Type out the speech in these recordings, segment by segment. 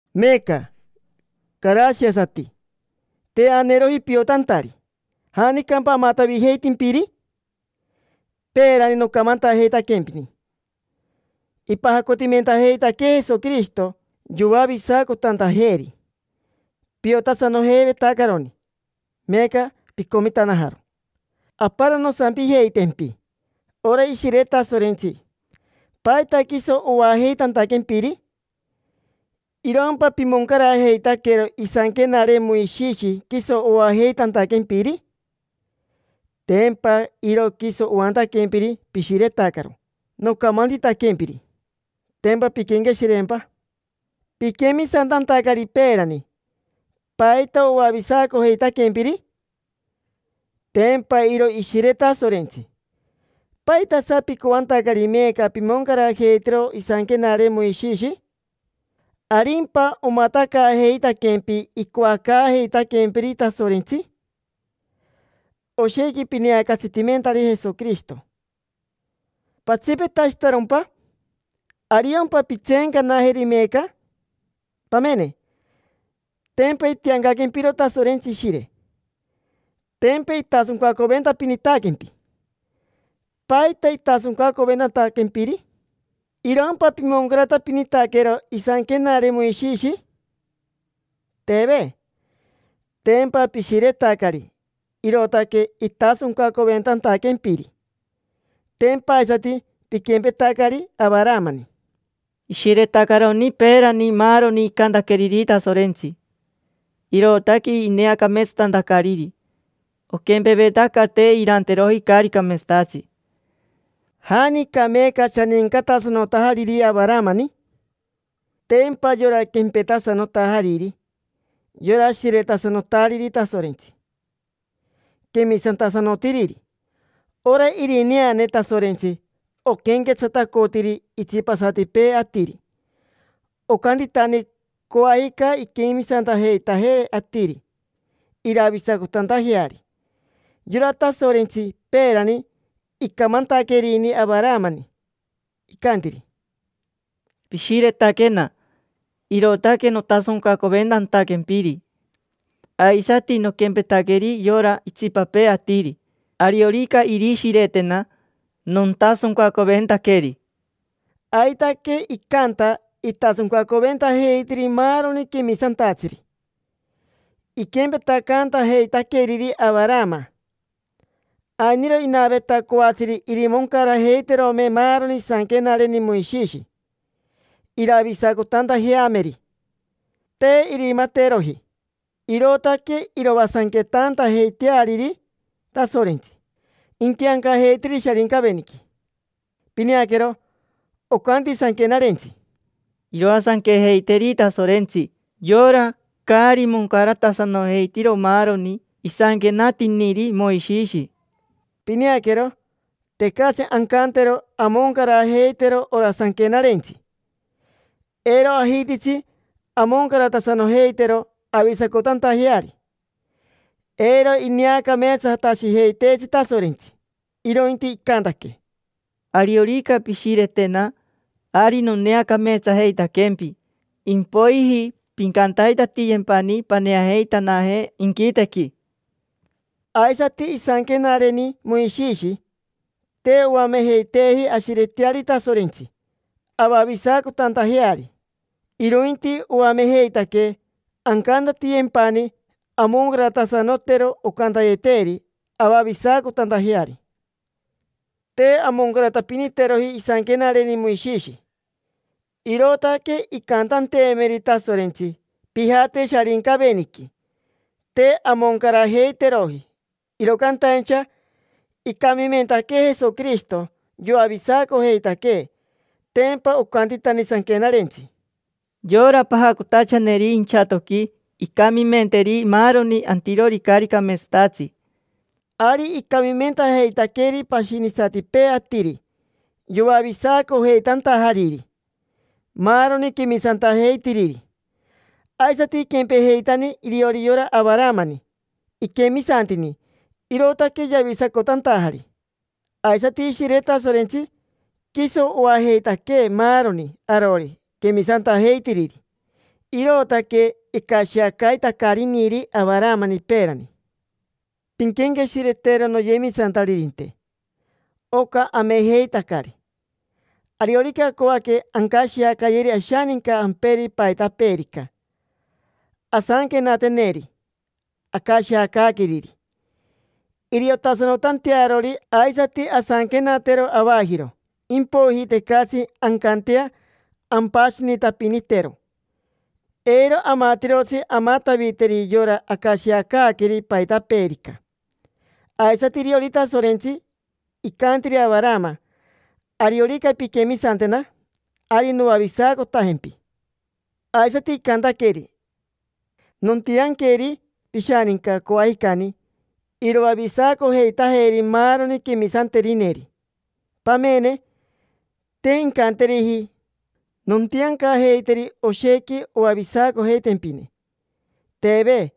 Meeca, carashiasati, te aneeroji piotantari. ¿Janicampa amatavijeitimpiri? Peerani nocamantajeitaquempini ipajacotimentajeitaquee Jesoquirishito yoavisacotantajeeri. Piotasanojeivetacaroni, meeca picomitanajaro. Aparo nosampijeitempi: ora Ishire Tasorentsi, ¿paita quiso oajeitantaquempiri? ¿Irompa pimoncarajeitaquero isanquenare Moishishi quiso oajeitantaquempiri? Tempa iro quiso oantaquempiri pishiretacaro nocamantitaquempiri. Tempa pinquenqueshireempa. Piquemisantantacari peerani, ¿paita oavisacojeitaquempiri? Tempa iro Ishire Tasorentsi. ¿Paitasa picoantacari meeca pimoncarajeitero isanquenare Moishishi? ¿Arimpa omatacaajeitaquempi icoacaajeitaquempiri Tasorentsi? Oshequi pineacatsitimentari Jesoquirishito. ¿Patsipetashitarompa? ¿Ariompa pintseencanajeri meeca? Pamene: tempa itiancaquempiro Tasorentsi Ishire. Tempa itasoncacoventapinitaquempi. ¿Paita itasoncacoventantaquempiri? ¿Irompa pimoncaratapinitaquero isanquenare Moishishi? Teve. Tempa pishiretacari, irootaque itasoncacoventantaquempiri. Tempa aisati piquempetacari Avaramani. Ishiretacaroni peerani maaroni icantaqueriri Tasorentsi, irootaque ineacameetsatantacariri, oquempevetaca te iranteroji caari cameetsatatsi. ¿Janica meeca shanincatasanotajariri Avaramani? Tempa yora quempetasanotajariri: yora shiretasanotariri Tasorentsi, quemisantasanotiriri. Ora irineane Tasorentsi oquenquetsatacotiri itsipasatipee atiri. Ocantitani coajica inquemisantajeitaje atiri iravisacotantajeari. Yora Tasorentsi peerani icamantaquerini Avaramani, icantiri: “Pishiretaquena, irootaque notasoncacoventantaquempiri. Aisati nonquempetaqueri yora itsipapee atiri: ariorica irishiretena, nontasoncacoventaqueri”. Aitaque icanta, itasoncacoventajeitiri maaroni quemisantatsiri, iquempetacantajeitaqueriri Avarama. Ainiro inaveta coatsiri irimoncarajeiterome maaroni isanquenareni Moishishi, iravisacotantajeameri. Te irimateroji, irootaque iroasanquetantajeiteariri Tasorentsi, intiancajeiteri Sharincaveniqui. Pineaquero, ocanti Sanquenarentsi: “Iroasanquejeiteri Tasorentsi yora caari moncaratasanojeitiro maaroni isanquenatiniri Moishishi”. Pineaquero, tecatsi ancantero amoncarajeitero ora sanquenarentsi. Eiro ajititsi amoncaratasanojeitero avavisacotantajeari. Eiro ineacameetsatashijeiteetsi Tasorentsi, irointi icantaquee: “Ariorica pishiretena, ari noneacameetsajeitaquempi, impoiji pincantaitatiyempani paneajeitanaje inquitequi”. Aisati isanquenareni Moishishi, te oamejeiteeji ashireteari Tasorentsi avavisacotantajeari, irointi oamejeitaquee ancantatiyempani amoncaratasanotero ocantayeteeri, avavisacotantajeari. Te amoncaratapiniteroji isanquenareni Moishishi, irootaque incantanteemeri Tasorentsi: “Pijate Sharincaveniqui”. Te amoncarajeiteroji, iro cantaincha icamimentaquee Jesoquirishito, yoavisacojeitaquee. Tempa ocantitani Sanquenarentsi: “Yora pajacotachaneri inchatoqui incamimenteri maaroni antirori caari cameetsatatsi”. Ari icamimentajeitaqueri pashinisatipee atiri, yoavisacojeitantajariri maaroni quemisantajeitiriri. Aisati iquempejeitani iriori yora Avaramani, iquemisantini, irootaque yavisacotantajari. Aisati Ishire Tasorentsi, quiso oajeitaquee maaroni arori quemisantajeitiriri. Irootaque icashiacaitacariniri Avaramani peerani. Pinquenqueshiretero, noyemisantaririnte, oca amejeitacari. Ariorica acoaque ancashiacayeri ashaninca amperi paitapeerica, asanquenateneri acashiacaaqueriri, iriotasanotantearori. Aisati asanquenatero avajiro. Impoiji tecatsi ancantea ampashinitapinitero, eiro amatirotsi amataviteri yora acashiacaaqueri paitapeerica. Aisati iriori Tasorentsi, icantiri Avarama: “Ariorica pinquemisantena, ari noavisacotajempi”. Aisati icantaqueri: “Nontianqueri pishaninca, coajicani, iroavisacojeitajeri maaroni quemisanterineri”. Pamene, te incanteriji: “Nontiancajeiteri oshequi oavisacojeitempine”. Teve.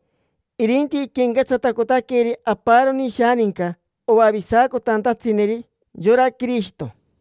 Irinti iquenquetsatacotaqueri aparoni ishaninca, oavisacotantatsineri: yora Quirishito.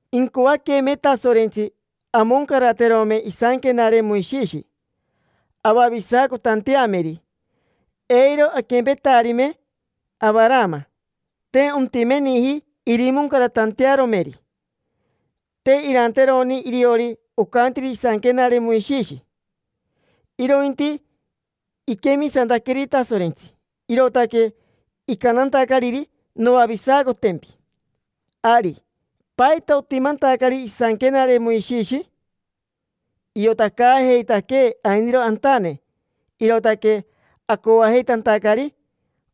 Incoaqueme Tasorentsi amoncaraterome isanquenare Moishishi avavisacotanteameri, eiro aquempetarime Avarama. Te ontimeniji irimoncaratantearomeri. Te iranteroni iriori ocantiri isanquenare Moishishi, irointi iquemisantaqueri Tasorentsi, irootaque icantantacariri: “Noavisacotempi”. Ari, ¿paita otimantacari isanquenare Moishishi? Iotacaajeitaquee ainiro antane, irootaque acoajeitantacari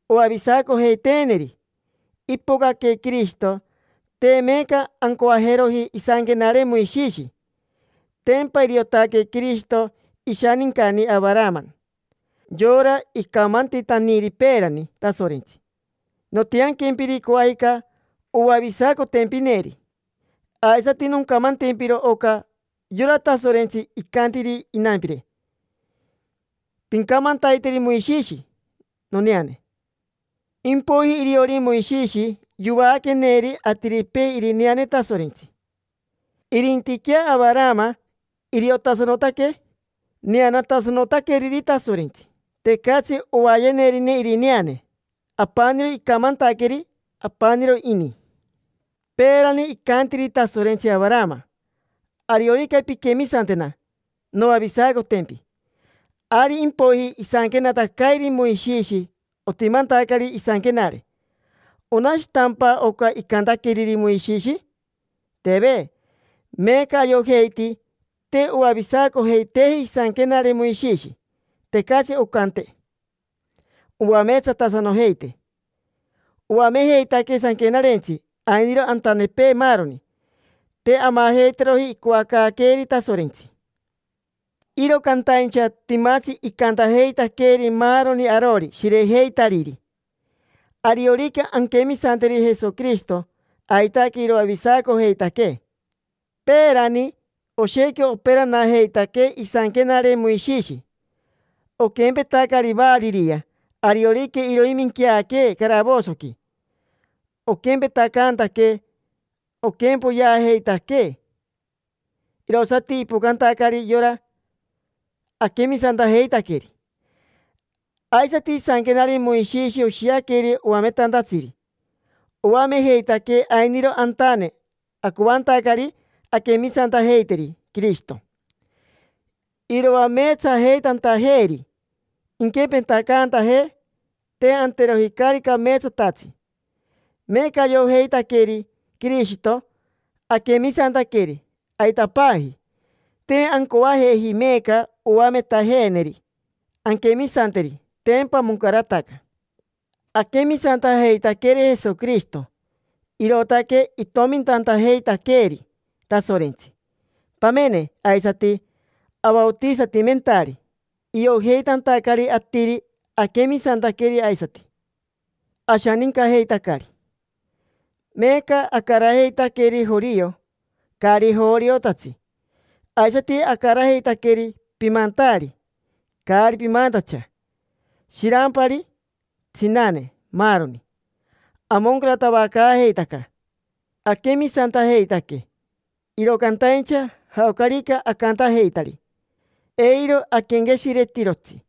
oavisacojeiteeneri. Ipocaque Quirishito, te meeca ancoajeroji isanquenare Moishishi. Tempa iriotaque Quirishito ishanincani Avarama: yora icamantitaniri peerani Tasorentsi: “Nontiaquempiri coajica oavisacotempineri”. Aisati noncamantempiro oca: yora Tasorentsi icantiri inampire: “Pincamantaiteri Moishishi noneane”. Impoiji iriori Moishishi yovaaqueneri atiripee irineane Tasorentsi. Irintiquea Avarama iriotasanotaque neanatasanotaqueriri Tasorentsi, tecatsi ovayenerine irineane. Apaniro icamantaqueri, apaniro ini. Peerani icantiri Tasorentsi Avarama: “Ariorica pinquemisantena, noavisacotempi”. Ari impoiji isanquenatacairi Moishishi, otimantacari isanquenare. ¿Onashitampa oca icantaqueriri Moishishi? Teve. Meeca ayojeiti te oavisacojeiteeji isanquenare Moishishi, tecatsi oncante oameetsatasanojeitee. Oamejeitaquee sanquenarentsi ainiro antanepee maaroni. Te amajeiteroji icoacaaqueeri Tasorentsi. Iro cantaincha timatsi icantajeitaqueeri maaroni arori shirejeitariri: ariorica anquemisanteri Jesoquirishito, aitaque iroavisacojeitaquee. Peerani, oshequi operanajeitaquee isanquenare Moishishi, oquempetacari variria, ariorica iroiminqueaquee caravosoqui. Oquempetacantaquee oquempoyeajeitaquee irosati ipocantacari yora aquemisantajeitaqueri. Aisati isanquenare Moishishi oshiaqueri oametantatsiri: oamejeitaquee ainiro antane, acoantacari anquemisantajeiteri Quirishito, iroameetsajeitantajeeri, inquempetacantajee te anteroji caari cameetsatatsi. Meeca ayojeitaqueri Quirishito, aquemisantaqueri. Aitapaji. Te ancoajeji meeca oametajeeneri anquemisanteri: tempa moncarataca. Aquemisantajeitaqueri Jesoquirishito, irootaque itomintantajeitaqueeri Tasorentsi. Pamene, aisati avaotisatimentari, iojeitantacari atiri aquemisantaqueri, aisati ashanincajeitacari. Meeca acarajeitaqueri jorio, caari joriotatsi, aisati acarajeitaqueri pimantaari, caari pimantacha, shirampari, tsinane, maaroni: amoncaratavacaajeitaca aquemisantajeitaque. Iro cantaincha jaocarica acantajeitari, eiro aquenqueshiretirotsi.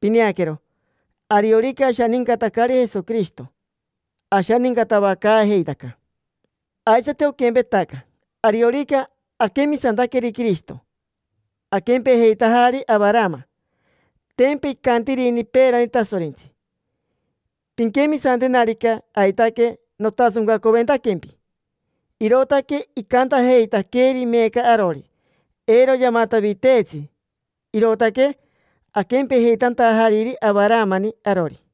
Pineaquero, ariorica ashanincatacari Jesoquirishito, ashanincatavacaajeitaca. Aisati oquempetaca, ariorica aquemisantaqueri Quirishito, aquempejeitajari Avarama. Tempa icantirini peerani Tasorentsi: “Pinquemisantenarica, aitaque nontasoncacoventaquempi”. Irootaque icantajeitaqueeri meeca arori, eiro yamataviteetsi, irootaque aquempejeitantajariri Avaramani arori.